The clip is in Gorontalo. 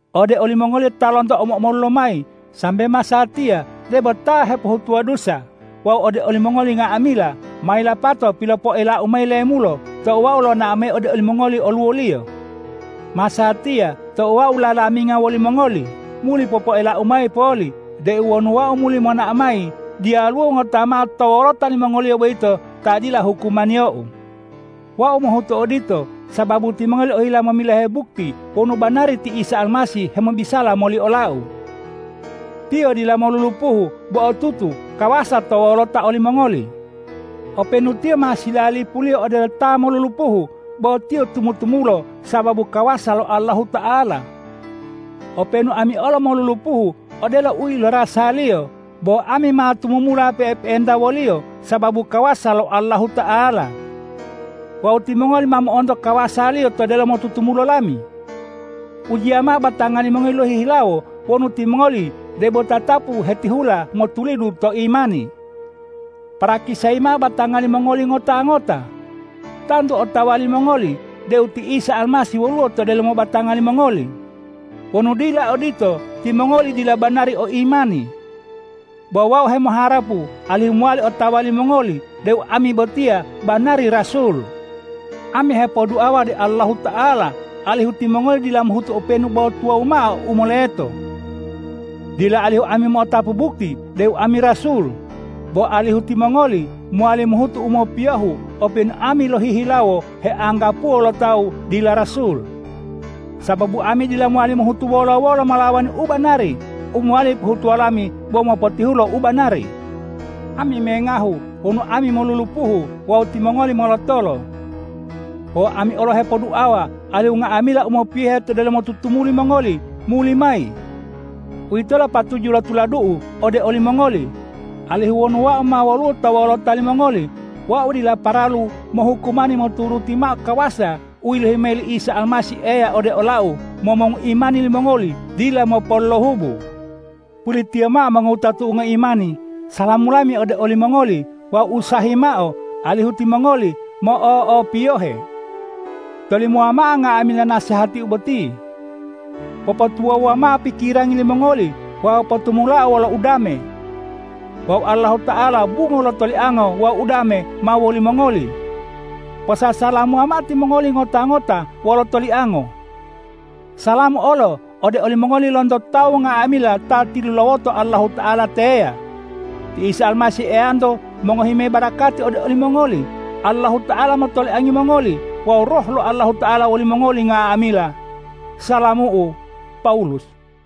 Ode olimongoliyo ta lonto omo-omolu lomayi sambe masatiya debo ta hepohutuwa dusa wawu ode olimongoli nga'amila, ma yilapato pilopoelau mayi lemulo tou wau lonao mayi ode olimongoli oluwoliyo. Masatiya tou wau lalaminga wolimongoli, muli popoelau mayi poli deu wonu wau muli monao mayi, diyaluwo ngota mao to wolota limongoliyo boyito ta dila hukumaniyou. Wau mohutu odito, sababu timongoli ohila momilohe bukti wonu banari ti Isa Almasih hemobisala moli olau. Tiyo dila molulupuhu bo otutu kawasa to wolota olimongoli. Openu Tiyo ma silalipuliyo odelo ta molulupuhu, bo Tiyo tumu-tumulo sababu kawasa lo Allahuta'ala. Openu ami olo molulupuhu odelo u ilorasa-Liyo, bo ami ma tumumula pe'epe'enta wo-Liyo sababu kawasa lo Allahuta'ala. Wawu timongoli ma mo'onto kawasa-Liyo to delomo tutumulo lami. Ujiya mao batanga limongoli lohihilawo wonu timongoli debo tatapu hetihula motulidu to imani. Parakisayi mao batanga limongoli ngota-ngota. Tantu otawa limongoli deu ti Isa Almasih woluwo to delomo batanga limongoli. Wonu dila odito, timongoli dila banari o imani. Bo wau hemoharapu alihu mowali otawa limongoli deu ami botiya banari rasul. Ami hepoduawa ode Allahuta'ala alihu timongoli dila mohutu openu bo tuwawu mao u moleto, dila alihu ami mo'otapu bukti deu ami rasul, bo alihu timongoli mowali mohutu u mopiyohu openu ami lohihilawo heanggapuwo lo tawu dila rasul. Sababu ami dila mowali mohutu wolo-wolo molawani u banari, u mowali pohutuwo lami bo mopotihulo u banari. Ami mengahu wonu ami molulupuhu wawu timongoli molotolo. Wawu ami olo hepoduawa alihu nga'amila u mopiyohe to delomo tutumuli mongoli muli mayi. Uwitolo patuju lo tuladu'u ode olimongoli, alihu wonu wau ma woluwo to wolota limongoli, wau dila paralu mohukumani moturuti mao kawasa u yilohi mayi li Isa Almasih Eya ode olau momongu imani limongoli dila mopolohubu. Pulitiyo mao mongowutatu'u ngoimani, salamu lami ode olimongoli wawu usahayi mao alihu timongoli mo'o'opiyohe. Tolimowa mao nga'amila nasehatiu boti. Popotuwawuwa mao pikirangi limongoli wawu potumulao wolo udame. Wawu Allahuta'ala bungo lo toliango wawu udame ma wolimongoli. Posasalamuwa mao timongoli ngota-ngota wolo toliango. Salamu olo ode olimongoli lonto tawu nga'amila ta tilulawoto Allahuta'ala teya. Ti Isa Almasih Eyanto mongohi mayi barakati ode olimongoli, Allahuta'ala motoliangi mongoli wawu Roh lo Allahuta'ala wolimongoli nga'amila. Salamu'u, Pawulus